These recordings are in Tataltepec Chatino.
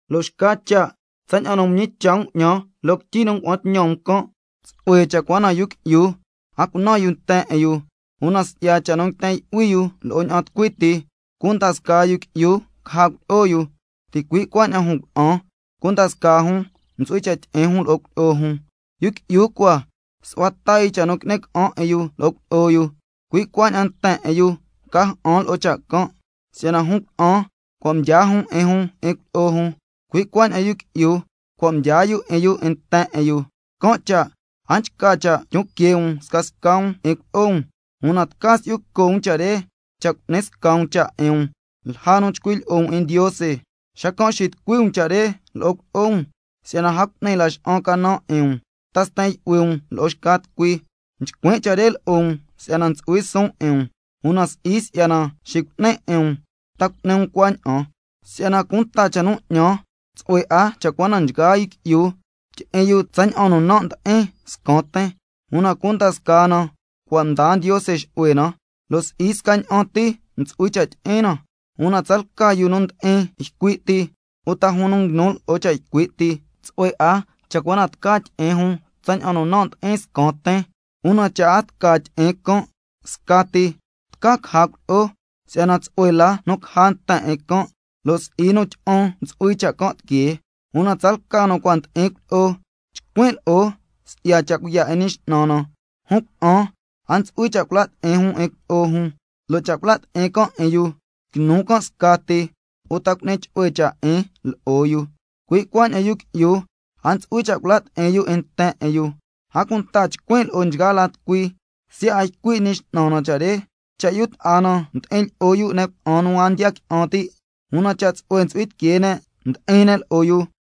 Lo' xca cha' tsaña'an nu mñicha' um 'ñan loo quityi nu ngua'an tñan um can', tsu'hue cha' cua na yu qui'yu a cunan yu nten 'in yu, una si'ya cha' nu nguiten yu'hui yu lo'o ña'an tucui ti, cunda scaa yu qui'yu caja cuilyi'o yu, ticui' cuaña'an jun cuna'an, cunda scaa jun ntsu'hui cha' tyi'in jun lo'o cuilyi'o jun. Yu qui'yu cua su'hua ta yu cha' nu qui'ni ca'an 'in yu lo'o cuilyi'o yu, cui' cuaña'an nten 'in yu ca ja'an lo'o cha' can'. Si'yana jun cuna'an, cua' mdyaa jun 'in jun 'in cuilyi'o jun, cui' cuaña'an yu qui'yu, cua' mdyaa yu 'in yu 'in nten 'in yu. Can' cha' a nchca cha' tyon quee' um scasca um 'in cuilyi'o um, una tca si'yu co' um cha' re, cha' cu'ni sca um cha' 'in um lja nu chcui' lyi'o um 'in Ndiose, xacan' xitucui um cha' re lo'o cuilyi'o um, si'yana a cu'ni laxa'an canan 'in um, ta sten yu'hui um lo'o xca tucui. Nchcuin' cha' re lo'o um si'yana ntsu'hui suun 'in um, una si'i si'yana xicu'nin 'in um ta cu'ni um cuaña'an. Si'yana cunta cha' nu 'ñan, tsu'hue 'a cha' cua na nchgaa yu qui'yu tyi'in yu tsaña'an nu nan' ndi'in scan tin, una cunda scaa na cua' mdaa Ndiose xu'hue na, lo' si'i scaña'an ti ntsu'hui cha' tyi'in na. Una tsalca yu nu ndi'in ycui' ti uta jun nu nguinu lo'o cha' ycui' ti, tsu'hue 'a cha' cua na tca tyi'in jun tsaña'an nu nan' ndi'in scan tin, una cha' a tca tyi'in can' scati tca caja cuilyi'o, si'yana tsu'hue la nu caja nten 'in can', lo' si'i nu tyi'an ntsu'hui cha' can' tiquee. Una tsalca nu cua' ndi'in cuilyi'o, chcuin' lo'o si'ya cha' cuiya' 'in Ñi X'nan na: Jun cuna'an a ntsu'hui cha' cula' ti'in jun 'in cuilyi'o jun, lo' cha' cula' ti'in can' 'in yu, quinu can' scati uta cu'ni chu'hue cha' 'in lo'o yu, cui' cuaña'an yu qui'yu a ntsu'hui cha' cula' ti'in yu 'in nten 'in yu. A cunta nchcuin' lo'o nchgaa la tucui, siya' a ycui' Ñi X'nan na cha' re: Cha' yu ta'a na ndi'in lyi'o yu ne' cuna'an nu a ndiya qui'an ti', una cha' tsu'hue ntsu'hui tiquee ne' ndi'in ne' lo'o yu,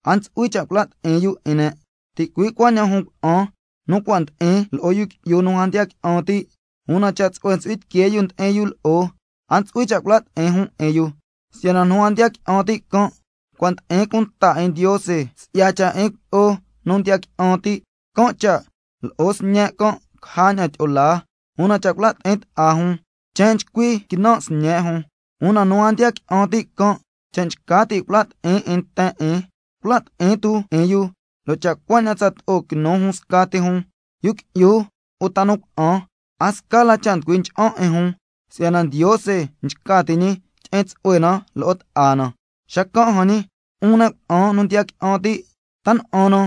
a ntsu'hui cha' cula' ti'in yu 'in ne'. Ticui' cuaña'an jun cuna'an nu ndi'in lo'o yu qui'yu nu a ndiya qui'an ti', una cha' tsu'hue ntsu'hui tiquee yu ndi'in yu lo'o jun, a ntsu'hui cha' cula' ti'in jun 'in yu. Si'yana nu a ndiya qui'an ti' can', cua' ndi'in cunta 'in Ndiose si'ya cha' 'in cuilyi'o nu ndiya qui'an ti', can' cha' lo'o sñe' can' caja ña'an tyi'o laa, una cha' cula' ti'in ta'a jun chen nchcui quinan' sñe' jun. Una cha' nu a ndiya qui'an ti' can' nchca ti' cula' ti'in 'in nten 'in, cula' ti'in tu 'in yu, lo' cha' cuaña'an tsato'o quinu jun scati jun, yu qui'yu uta nu cuna'an, a sca la cha' nducui ncha'an 'in jun, si'yana Ndiose nchca ti' ñi tyi'in tsu'hue na lo'o ta'a na. Xacan' jan ñi, 'un ne' cuna'an nu ndiya qui'an ti', ¿ta na'an na,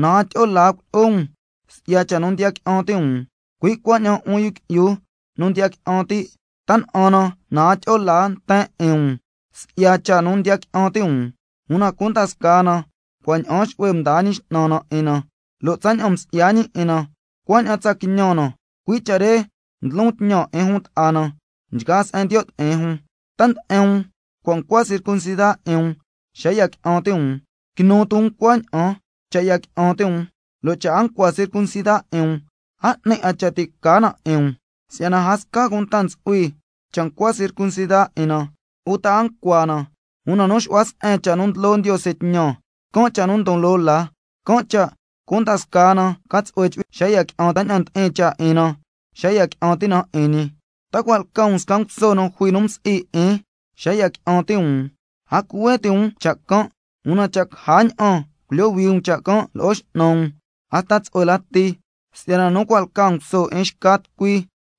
na a tyi'o laa cuilyi'o um si'ya cha' nu ndiya qui'an ti' um? Cui' cuaña'an 'un yu qui'yu nu ndiya qui'an ti', ¿ta na'an na, na a tyi'o laa nten 'in um si'ya cha' nu ndiya qui'an ti' um? Una cunda scaa na cua' ña'aan xu'hue mdaa Ñi X'nan na 'in na, lo' tsaña'an msi'ya ñi 'in na, cuaña'an tsa quiñan na. Cui' cha' re ndlon tñan 'in jun ta'a na nchgaa se'en ndiyo' ti'in jun. ¿Ta nde'en um cua' ncua circuncida 'in um xa ya qui'an ti' um? Quinu tu um cuaña'an. Cha' ya qui'an ti' um, lo' a ncua circuncida 'in um, a 'ni 'a cha' ti' ca na 'in um. Si'yana a sca cunta ntsu'hui cha' ncua circuncida 'in na uta a ncua na, una nu xu'hua se'en na cha' nu ndlo Ndiose tñan, can' cha' nu ndon loo la. Can' cha' cunda scaa na ca tsu'hue chu'hui tiquee na tsaña'an ndi'in cha' 'in na xa ya qui'an ti' na 'in ñi. ¿Ta cua' lca um sca nguso nu jui nu msi'i 'in xa ya qui'an ti' um? A cuhue ti' um cha' can', una cha' caja ña'an culyohui um cha' can' lo'o x'nan um, hasta tsu'hue lati. Si'yana nu cua' lca nguso 'in xca tucui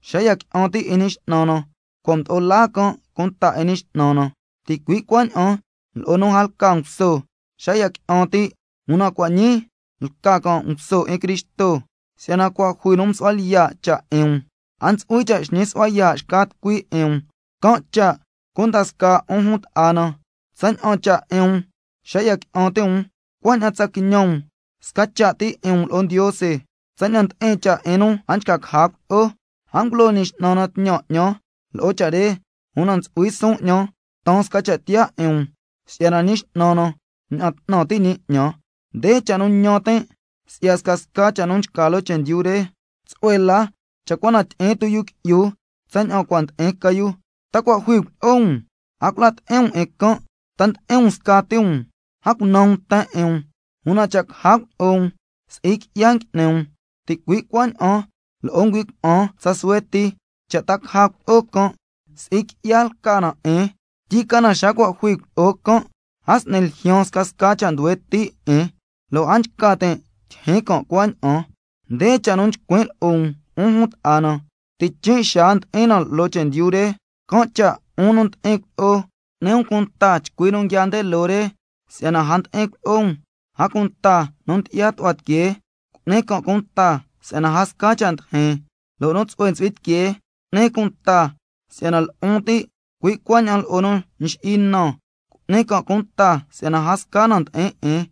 xa ya qui'an ti' 'in Ñi X'nan na, cua' mdo'o laa can' cunta 'in Ñi X'nan na, ticui' cuaña'an lo'o nu a lca nguso xa ya qui'an ti', una cua' ñii lca can' nguso 'in Cristo. Si'yana cua' jui nu msu'hua lyiya' cha' 'in um, a ntsu'hui cha' xñi su'hua yaa' xca tucui 'in um. Can' cha' cunda scaa 'un jun ta'a na, tsaña'an cha' 'in um xa ya qui'an ti' um, cuaña'an tsa quiñan um sca cha' ti 'in um lo'o Ndiose. Tsaña'an ndi'in cha' 'in nu a nchca caja cuilyi'o, a ngulo Ñi X'nan na tñan 'ñan lo'o cha' re, una ntsu'hui suun 'ñan taan sca cha' tiyaa 'in um si'yana Ñi X'nan na mña'an 'tnan ti' ñi 'ñan. Nde cha' nu ñan tin' cui' si'ya scasca cha' nu nchca loo chendyu re, tsu'hue la cha' cua na tyi'in tu yu qui'yu tsaña'an cua' ndi'in ca yu. ¿Ta cua' jui cuilyi'o um? A cula' ti'in um 'in can'. ¿Ta ndi'in um scati um? A cunan um nten 'in um. Una cha' caja cuilyi'o um, si'i qui'ya ngui'ni um, ticui' cuaña'an lo'o ngüi' cuna'an tsa suhue ti, cha' ta caja cuilyi'o can', si'i qui'ya lca na 'in, tyicana xa nu cua' jui cuilyi'o can', a s'ni ljyaan scasca cha' nduhue ti' 'in, lo' a nchca tin' tyijyin can' cuaña'an. Nde cha' nu chcuin' lo'o um, 'un jun ta'a na: Tichin' xaa ndi'in na loo chendyu re, can' cha' 'un nu ndi'in cuilyi'o, cu'ni um cunta chcui nu nguia nde loo re si'yana a ndi'in cuilyi'o um, a cunta nu ndyi'ya tu'hua tiquee, cu'ni can' cunta si'yana a sca cha' ndijin, lo' nu tsu'hue ntsu'hui tiquee cu'ni cunta si'yana lu'un ti', cui' cuaña'an lo'o nu nxi'i na cu'ni can' cunta si'yana a sca na ndi'in 'in.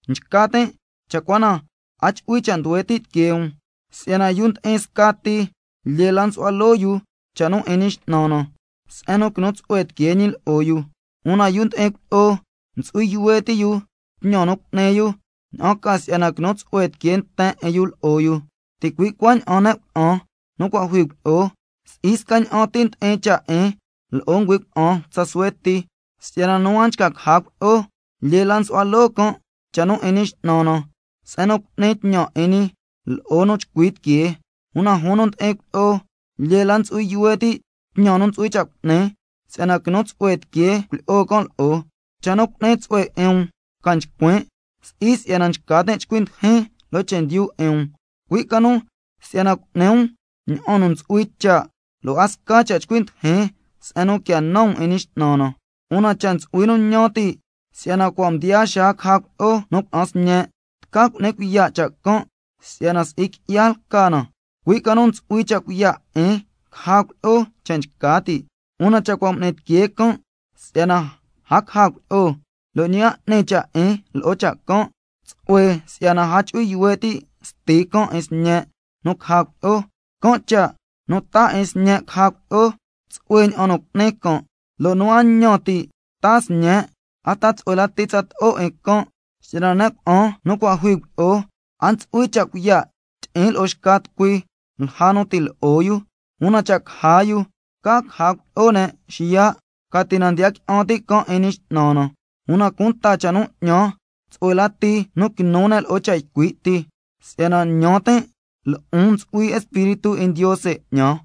Nchca tin' cha' cua na a chu'hui cha' nduhue ti' tiquee um, si'yana yu ndi'in scati lyee la nsu'hua loo yu cha' nu 'in Ñi X'nan na, se'en nu quinu tsu'hue tiquee ñi lo'o yu. Una yu ndi'in cuilyi'o, ntsu'hui yuhue ti' yu tñan nu cu'ni yu, ña'an ca si'yana quinu tsu'hue tiquee nten 'in yu lo'o yu. Ticui' cuaña'an ne' cuna'an nu cua' jui cuilyi'o, si'i scaña'an ti ndi'in cha' 'in lo'o ngüi' cuna'an tsa suhue ti, si'yana nu a nchca caja cuilyi'o, lyee la nsu'hua loo can' cha' nu 'in Ñi X'nan na, se'en nu cu'ni tñan 'in ñi lo'o nu nchcui tiquee. Una jun nu ndi'in cuilyi'o, lyee la ntsu'hui yuhue ti' tñan nu ntsu'hui cha' cu'ni, si'yana quinu tsu'hue tiquee cuilyi'o can' lo'o. Cha' nu cu'ni tsu'hue 'in um ca nchcuin', si'i si'yana nchca tin' chcui ndijin loo chendyu 'in um, cui' ca nu si'yana cu'ni um ña'an nu ntsu'hui cha', lo' a sca cha' chcui ndijin se'en nu quia nan um 'in Ñi X'nan na. Una cha' ntsu'hui nu ñan ti' si'yana cua' mdiyaa xaa caja cuilyi'o nu cuna'an sñe', tca cu'ni cuiya' cha' can' si'yana si'i qui'ya lca na, cui' ca nu ntsu'hui cha' cuiya' 'in caja cuilyi'o cha' nchca ti'. Una cha' cua' m'ni tiquee can' si'yana a caja cuilyi'o, lo' ñi a 'ni cha' 'in lo'o cha' can', tsu'hue si'yana a chu'hui yuhue ti' sti can' 'in sñe' nu caja cuilyi'o. Can' cha' nu taa 'in sñe' caja cuilyi'o, tsu'hue ña'an nu cu'ni can', lo' nu a ñan ti' taa sñe' hasta tsu'hue lati tsato'o 'in can'. Si'yana ne' cuna'an nu cua' jui cuilyi'o, a ntsu'hui cha' cuiya' tyi'in lo'o xca tucui lja nu ti' lo'o yu, una cha' caja yu tca caja cuilyi'o ne' xiya', ca ti na ndiya qui'an ti' can' 'in Ñi X'nan na. Una cunta cha' nu 'ñan, tsu'hue lati nu quinu can' lo'o cha' ycui' ti, si'yana ñan tin' lo'on ntsu'hui Espíritu 'in Ndiose 'ñan.